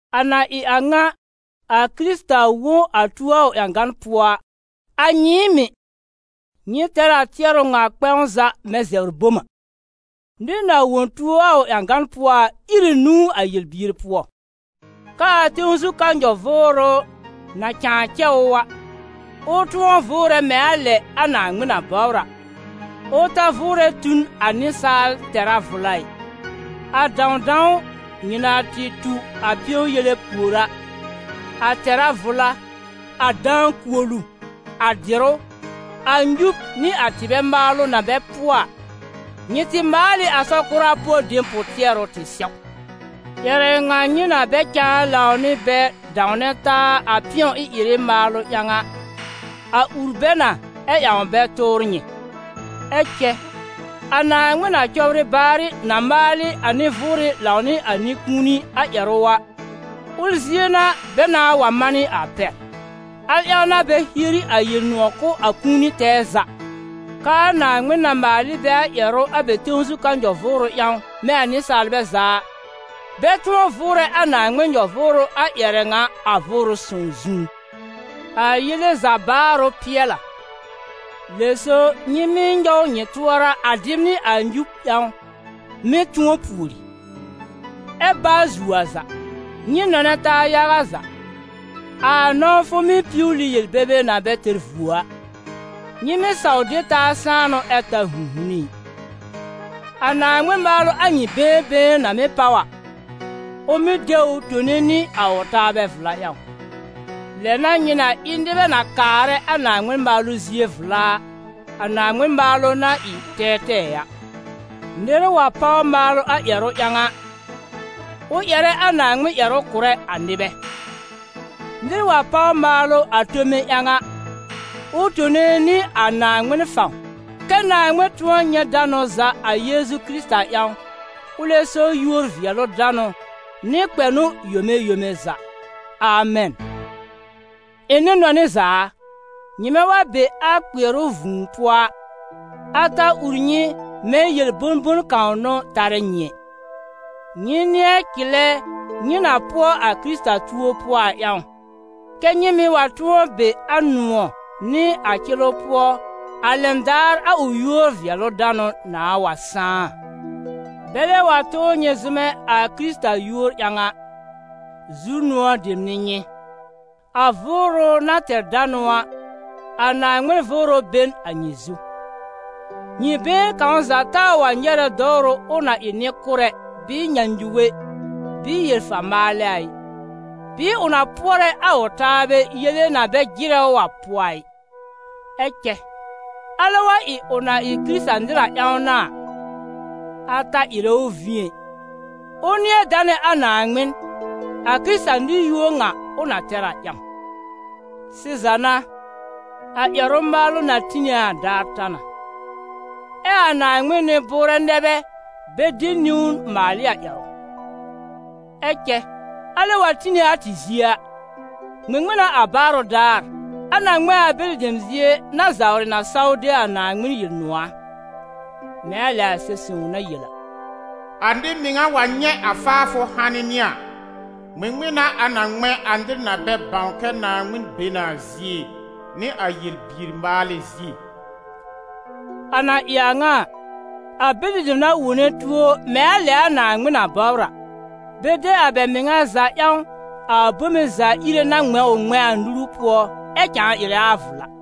A na ɩ a ŋa, a Kɩrɩta wõ a tuo a ʋ ƴãgan pʋɔ a, a nyɩɩm mɩ̀, nyɩ tɛr a tɩɛrʋ ŋa kpɛ̃w za mɛ̃ zɛbr bom a: nɩr na wõ tuo a ʋ ƴãgan pʋɔ a, ír ɩ nũu a yel-bier pʋɔ; k'aa tẽw zu ka nyɔ-vʋʋrʋ na cãa cɛ ʋ a, ʋ tʋ̃ɔ vʋʋrɛ mɛ̃ a lɛ a Naaŋmɩn na bɔbr a, ʋ ta vʋʋrɛ tu n a nɩsaal tɛ̀rá vʋla ɩ. A dãwdãw nyɩ na tɩ tu a pɩ̃ɔ-yele pùor a, a tɛ̀rá vʋla, a dãa-kuolu, a dɩ̀rʋ́, a nyub nɩ a tɩbɛ maalʋ na bɛ pʋɔ a, nyɩ tɩ maal ɩ a sɔ-kʋra pʋɔ dem pʋ-tɩɛrʋ tɩ sɛw. Ƴɛrɛ ŋa nyɩ na bɛ cãa lãw nɩ bɛ dãwnɛ taa a pɩ̃ɔ ɩ-ɩrɩ maalʋ ƴãw a, a ur bɛ na ɛ ƴãw bɛ tʋʋr nyɩ. Ɛ cɛ a Naaŋmɩn na cɔbrɩ baarɩ na maal ɩ a nɩ-vʋʋrɩ lãw nɩ a nɩ-kũuni a ƴɛrʋ a, ʋl zie n'a bɛ nãà wa manɩ a pɛr. Al ƴãw n'a bɛ hieri a Yel-nʋ̃ɔ̀ kʋ̀ a kũuni tɛɛ za, k'aa Naaŋmɩn na maal ɩ bɛ a ƴɛrʋ a bɛ tẽw zu ka nyɔ-vʋʋrʋ ƴãw, mɛ̃ a nɩsaalbɛ za a, bɛ tʋ̃ɔ vʋʋrɛ a Naaŋmɩn nyɔ-vʋʋrʋ a ƴɛrɛ ŋa a Vʋʋrʋ Sõw zũú. A yele za baarʋ pɩɛl a, lɛ so nyɩ mɩ́ nyɔw nyɩ tʋɔra a dɩb nɩ a nyub ƴãw, mɩ́ tʋ̃ɔ pùori. Ɛ baa zuo a za, nyɩ nɔnɛ taa yaga za, a nɔ̃wfʋ mɩ́ piwli yel-bebe na bɛ tɛr vuo a. Nyɩ mɩ́ saw de taa sãanʋ ɛ ta 'hũ'hune ɩ. A Naaŋmɩn maalʋ a nyɩ been been na mɩ́ páw a, ʋ mɩ́ de ʋ tone nɩ a ʋ taabɛ vla ƴãw. Lɛ n'a nyɩ na ɩ nɩbɛ na kaarɛ a Naaŋmɩn maalʋ zie vla a, a Naaŋmɩn maalʋ na ɩ tɛɛtɛɛ a. Nɩr wa páw maalʋ a ƴɛrʋ ƴãw a, ʋ ƴɛrɛ a Naaŋmɩn ƴɛrʋ kʋrɛ a nɩbɛ. Nɩr wa páw maalʋ a tome ƴãw a, ʋ tone nɩ a Naaŋmɩn fãw, kɛ́ Naaŋmɩn tʋ̃ɔ nyɛ̃ danʋ za a Yeezu Kɩrɩta ƴãw, ʋlɛ so yúor-vɩɛlʋ-danʋ nɩ kpɛnʋ yome yome za. Amɛn. Ɩ̃ nɩ-nɔnɩ za a, nyɩmɛ wa be a kpɩɛrʋ vũu pʋɔ a, a ta ur nyɩ mɛ̃ yel bõ-bon kãw n'ʋ tarɛ nyɩ ɛ. Nyɩ nɩ̃ɛ cɩlɛ nyɩ na pʋɔ a Kɩrɩta tuo pʋɔ a ƴãw, kɛ́ nyɩ mɩ̀ wa tʋ̃ɔ be a nʋ̃ɔ̀ nɩ a cɩlʋ pʋɔ, a lɛn daar a ʋ yúor-vɩɛlʋ-danʋ nãà wa sãá a. Bɛlɛ wa tʋʋr nyɩ zʋmɛ a Kɩrɩta yúor ƴãw a, zu-nʋ̃ɔ̀ dem n'ɩ nyɩ, a Vʋʋrʋ na tɛr danʋ a, a Naaŋmɩn Vʋʋrʋ be n a nyɩ zu. Nyɩ been kãw za taa wa nyɛrɛ dɔwrʋ ʋ na ɩ nɩ-kʋrɛ, bɩɩ nyãnyuge, bɩɩ yel-fa-maalɛ a ɩ, bɩɩ ʋ na pʋɔrɛ a ʋ taabɛ yele na bɛ jɩrɛ ʋ a pʋɔ a ɩ. Ɛ cɛ alɛ wa ɩ ʋ na ɩ Kɩrɩta-nɩr a ƴãw n'a a, a ta ɩrɛ ʋ vĩ ɛ, ʋ nɩ̃ɛ danɛ a Naaŋmɩn, a Kɩrɩta-nɩr yúor ŋa ʋ na tɛr a ƴãw. Sɩza n' a, a ƴɛrʋ-maalʋ na tine a daar ta na. Ɛ a Naaŋmɩn nɩ-bʋʋrɛ nɛ bɛ bɛ de niwn maal ɩ a ƴɛrʋ. Ɛ cɛ alɛ wa tine a tɩ zie a, ŋmɩŋmɩn n'a a baarʋ daar, a na ŋmɛ̃ a bɛlɩ dem zie na zawrɩ na saw de a Naaŋmɩn Yel-nʋ̃ɔ̀ a? Mɛ̃ a lɛ a Sɛb-sõw na yel a: «A nɩ-mɩŋa wa nyɛ̃ a faafʋ hanɩ nɩ a, ŋmɩŋmɩn n'a a na ŋmɛ̃ a nɩr na bɛ bãw kɛ Naaŋmɩn be na a zie, nɩ a yel-bier-maalɛ zie?» A na ɩ a ŋa a, a bɛlɩ dem na wone tuo mɛ̃ a lɛ a Naaŋmɩn na bɔbr a, bɛ de a bɛ mɩŋa za ƴãw a Bome-za-Ire na ŋmɛ̃ ʋ ŋmɛ̃a a nuru pʋɔ, ɛ cãa ɩrɛ a vla.